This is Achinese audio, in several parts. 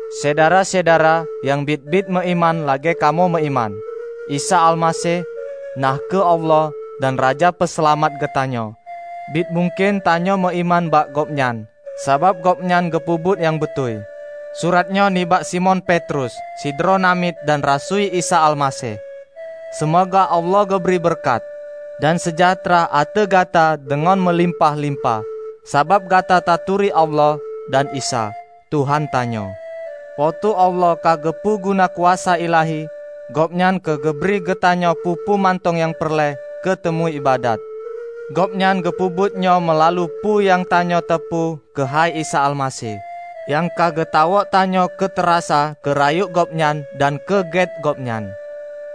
Syedara-syedara nyang biet-biet meuiman lagée kamoe meuiman! Isa Almaseh, na kheueh Allah dan Raja Peuseulamat geutanyoe, biet mungken tanyoe meuiman bak Gobnyan, sabab Gobnyan geupeubuet nyang beutôi. Surat nyoe nibak Simon Petrus, sidroe namiet dan rasui Isa Almaseh. Seumoga Allah geubri beureukat dan seujahtra ateueh gata deungon meulimpah-limpah, sabab gata taturi Allah dan Isa, Tuhan tanyoe. Po teu Allah ka geupeu guna kuasa ilahi Gobnyan keu geubri keugeutanyoe peue-peue mantong nyang peureulée keu tameuiébadat. Gobnyan geupeubuet nyoe meulalu peue nyang tanyoe teupeu keuhai Isa Almaseh, nyang ka geutawök tanyoe keu tarasa keurayeuk Gobnyan dan keu gét Gobnyan.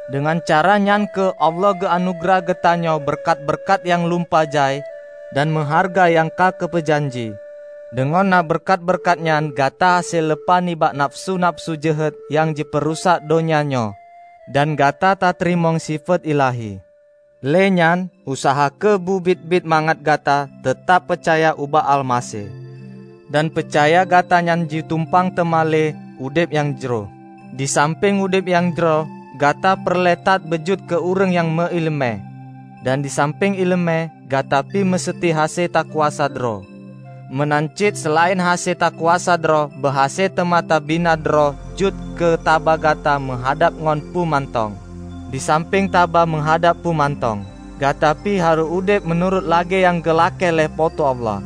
Deungon cara nyan kheueh Allah geuanugeurah keugeutanyoe beureukat-beureukat nyang lumpah jai dan meuhareuga nyang ka geupeu janji. Deungon na beureukat-beureukat nyan gata hase leupah nibak nafeusu-nafeusu jeuhet nyang jipeurusak donya nyoe, dan gata tateurimong sifeuet ilahi. Lé nyan, useuha kheueh beu biet-biet mangat gata teutab peucaya ubak Almaseh dan peucaya gata nyan jitumpang teuma lé udeb nyang jroh. Disampéng udeb nyang jroh, gata peureulée that beujeuet keu ureuëng nyang meuiéleumé, dan disampéng iéleumé, gata pih meuseuti hase takuasa droe. Meunan cit seulaén hase takuasa droe beuhase teuma tabina droe jeuet keu tabah gata meuhadab ngon peue mantong. Disampéng tabah meuhadab peue mantong, gata pih harôh udeb meunurot lagée nyang geulakée lé Po teu Allah.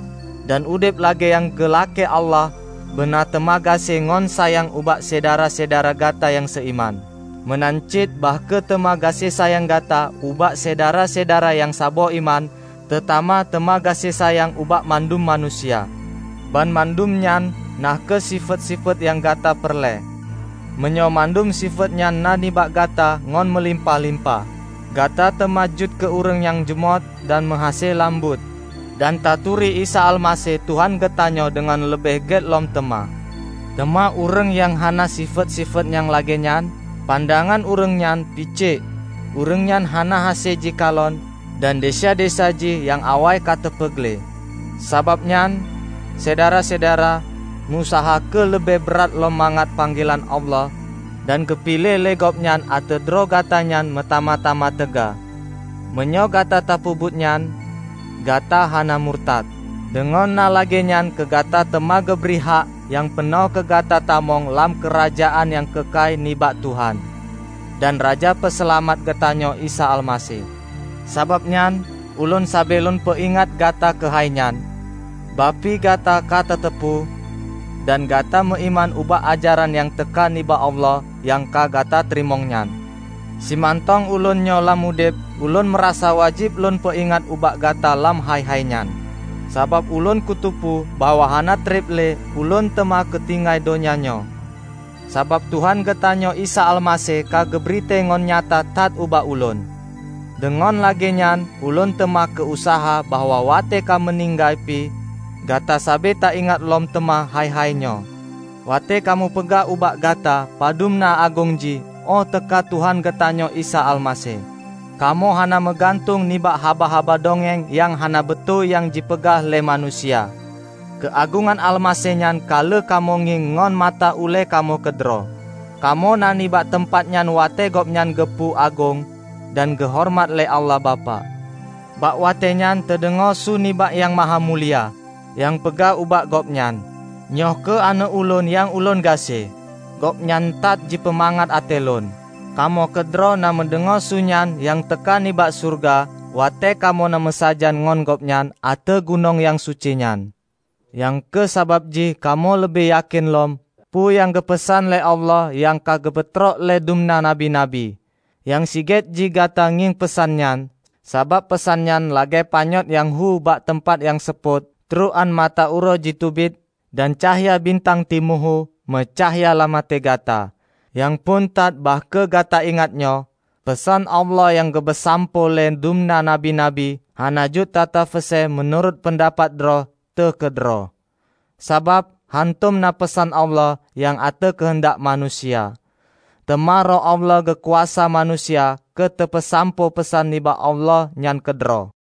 Dan udeb lagée nyang geulakée lé Allah beuna teuma gaséh ngon sayang ubak syedara-syedara gata nyang seuiman. Meunan cit bah kheueh teuma gaséh sayang gata ubak syedara-syedara nyang saboh iman teutamah teuma gaséh sayang ubak mandum manusia. Banmandum nyan na kheueh sifeuet-sifeuet nyang gata peureulée. Meunyoe mandum sifeuet nyan na nibak gata ngon meulimpah-limpah, gata teuma jeuet keu ureuëng nyang jumôt dan meuhase lam buet, dan taturi Isa Almaseh Tuhan geutanyoe deungon leubeh gét lom teuma. Teuma ureuëng nyang hana sifeuet-sifeuet nyang lagée nyan, pandangan ureuëng nyan picék; ureuëng nyan hana hase jikalon dan desya-desya jih nyang awai ka teupeugleh. Sabab nyan, Syedara-syedara, meu-useuha kheueh leubeh brat lom mangat panggelan Allah dan geupiléh lé Gobnyan ateueh droe gata nyan meutamah-tamah teuga. Meunyoe gata tapeubuet nyan, gata hana murtad. Deungon na lagée nyan keugata teuma geubri hak nyang peunoh keu gata tamong lam Keurajeuen nyang keukai nibak Tuhan dan Raja Peuseulamat geutanyoe Isa Almaseh. Sabab nyan, ulôn sabe lôn peuingat gata keuhai nyan, bah pi gata ka tateupeue dan gata meuiman ubak ajaran nyang teuka nibak Allah nyang ka gata teurimong nyan. Simantong ulôn nyoe lam udeb, ulôn meurasa wajéb lôn peuingat ubak gata lam hai-hai nyan. Sabab ulôn kuteupeu bahwa hana treb lé ulôn teuma kutinggai donya nyoe, sabab Tuhan geutanyoe Isa Almaseh ka geubri tée ngon nyata that ubak ulôn. Deungon lagée nyan ulôn teuma ku-useuha bahwa watée ka meuninggai pih, gata sabe taingat lom teuma hai-hai nyoe. Watée kamoe peugah ubak gata padub na agong jih óh teuka Tuhan geutanyoe Isa Almaseh, kamoe hana meugantung nibak haba-haba dongeng nyang hana beutôi nyang jipeugah lé manusia. Keuagongan Almaseh nyan ka lheueh kamoe ngieng ngon mata ulée kamoe keudroe. Kamoe na nibak teumpat nyan watée Gobnyan geupeu agong dan geuhoreumat lé Allah Bapak. Bak watée nyan teudeungoe su nibak Nyang Mahamulia, nyang peugah ubak Gobnyan, "Nyoe kheueh Aneuëk Ulôn nyang Ulôn gaséh. Gobnyan that jipeumangat até Lôn!" Kamoe keudroe na meudeungoe su nyan nyang teuka nibak syeuruga watée kamoe na meusajan ngon Gobnyan ateueh gunong nyang suci nyan. Nyang kheueh sabab jih kamoe leubeh yakén lom peue nyang geupeusan lé Allah nyang ka geupeutrok lé dumna nabi-nabi. Nyang sigét jih gata ngieng peusan nyan, sabab peusan nyan lagée panyöt nyang hu bak teumpat nyang seupôt trok án mata uroe jiteubiet, dan cahya bintang timu hu meucahya lam até gata. Nyang phon that bah kheueh gata ingat nyoe: Peusan Allah nyang geupeusampoe lé dumna nabi-nabi hana jeuet tatafeuse meunurot peundapat droe teuh keudroe. Sabab, hántom na peusan Allah nyan ateueh keuheundak manusia. Teuma Roh Allah geukuasa manusia keuteupeusampoe peusan nibak Allah nyan keudroe.